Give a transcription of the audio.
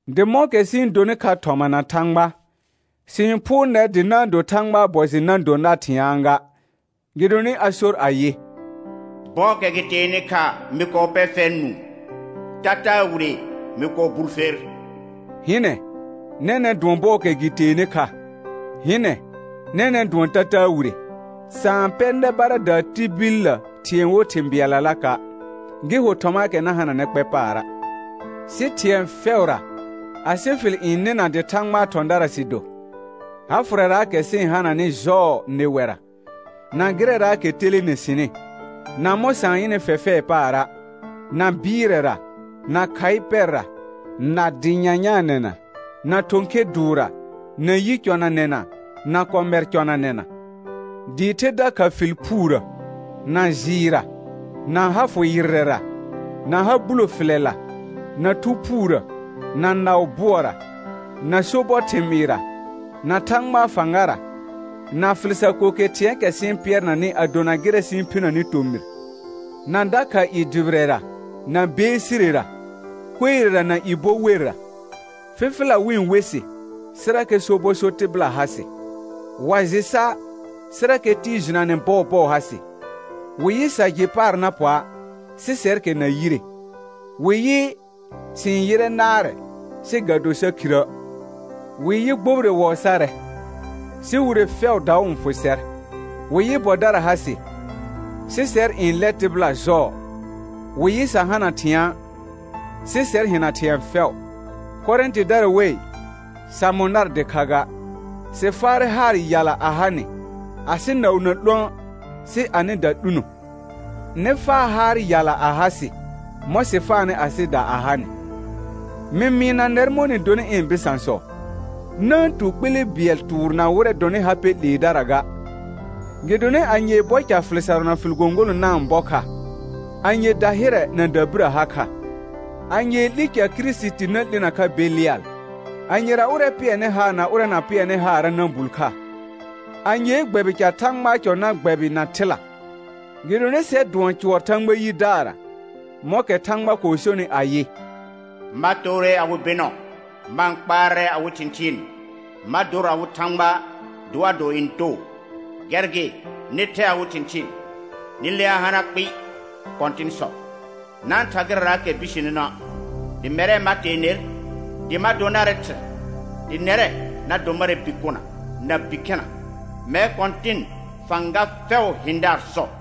Dɩ mɔ̃kɛ sɩ-n donɩ kha thɔma na Thãgba, sɩ-n phʋʋr nɛr dɩ na-n do Thãgbaa bɔ jɩ na do nar thɩ̃aa ga. Gɩdonɩ a sor ayɩ: «Bɔɔkɛ gɩ teenɩ kha mɩ kɔɔ pɛ fɛr nũu, tataa wire mɩ kɔɔ bul fer.» Hɩnɛ, nɛnɛ̃ dʋɔn bɔɔkɛ gɩ teenɩ kha. Hɩnɛ, nɛnɛ̃ dʋɔn tataa wire. Sa-n pɛ nɛ baradaa tibillə thɩ̃ɛ wo thɩ̃ bɩɛllalaka', gɩ ho thɔmaakɛ na hananɛ kpɛ paara'. Sɩ thɩ̃ɛ fɛʋra, asɩ fɩl n nɩna dɩ Thãgbaa thɔ̃dara sɩ do, ha fʋrɛraakɛ sɩ-n hananɩ jɔɔ nɩwɛra, na gɩrɛraakɛ telene sɩnɩ, na mɔ̃ sa-n yɩnɩ fɛfɛɛ paara', na bɩɩrɛra, na khaɩ pɛrra, na dɩ nyanyaanɛna, na thɔ̃ khe dʋʋrra, na yi cɔnanɛna, na kɔmɛr cɔnanɛna, dɩɩ the dakha fɩl phuurə, na jɩɩrra, na ha fʋ yɩrrɛra, na ha bulo fɩlɛla, na Thu Phuurə, na naʋ bʋɔra, na sobɔ thɩmɩɩrra, na Thãgbaa fãgara, na fɩl sar ko ke thɩ̃ɛɛkɛ sɩ-n pɩɛrnanɩ a dona gɩrɛ sɩ-n phinəni tomɩr; na dakha i dʋbɩrɛra, na beesirera, kuerera na i bɔ werra; fɩfɩla wɩ-n we sɩ, sɩrakɛ sobɔ so tɩbɩla ha sɩ. Wa jɩ sa', sɩrakɛ tɩɩ jɩnanɛ bɔɔbɔɔ ha sɩ; wɩ yɩ sa jɩ paar na pɔa', sɩ sɛrkɛ na yire; wɩ yɩ sɩ-n yɩrɛ naarɛ, sɩ ga do sa khirə'; wɩ yɩ gbobire wɔɔ sarɛ, sɩ wire fɛʋ daʋ n fʋ sɛr; wɩ yɩ bɔdara ha sɩ, sɩ sɛr n lɛ tɩbɩla jɔɔ; wɩ yɩ sa hana thɩ̃a', sɩ sɛr hɩna thɩ̃ɛ fɛʋ. Korɛ̃tɩdara wei, sa mʋ̃ nar dɩkha ga, sɩ faarɛ haar yala a ha nɩ. Asɩ naʋ na 'lũə', sɩ anɩda 'luno. Nɩ faa haar yala a ha sɩ mɔ̃ sɩ faanɩ asɩda a ha nɩ, mɩ mɩɩna nɛr mɔ̃ nɩ donɩ ɩ̃ bɩsãsɔ. Na-n tu kpele bɩɛl tʋʋr na wɩrɛ dɔnɩ ha pɛ 'leedara ga. Gɩdonɩ anyee bɔ ca fɩl sarʋ na fɩl gõgolõ na-n bɔ kha? Anye dahɩrɛ na dabirə ha kha? Anyee 'li ca Kirisiti na 'linə kha Belɩal? Anyera ʋrɛ pɩɛrnɩ haar na ʋrɛ na pɩɛrnɩ haara' na bul kha? Anyee gbɛbɩ ca Thãgbaa cɔ na gbɛbɩ na thɩla? Gɩdonɩ sɛr dʋɔn cʋɔr Thãgba yidaarra, mɔ̃kɛ Thãgba kɔɔ sonɩ ayɩ: «Ma toore awɩ bɩnɔ, ma-n kpaarɛ awɩ thɩ̃thɩɩn. Ma dor awɩ Thãgba, dɩ wa dor ɩ̃ too.» Gɛr gɩ, «Nɩ thɛ awɩ thɩ̃thɩɩn, nɩ lea hana kpɩɩ, Kɔ̃tɩn sɔ. Na-n tha gɩrɛraakɛ bisenenə', dɩ mɛrɛ ma tee ner, dɩ ma do narɛ Thɩrɛ, dɩ nɛrɛ na do marɛ bikona na bikhɛna, mɛr Kɔ̃tɩn fãga fɛʋʋ hɩ̃daar sɔ.»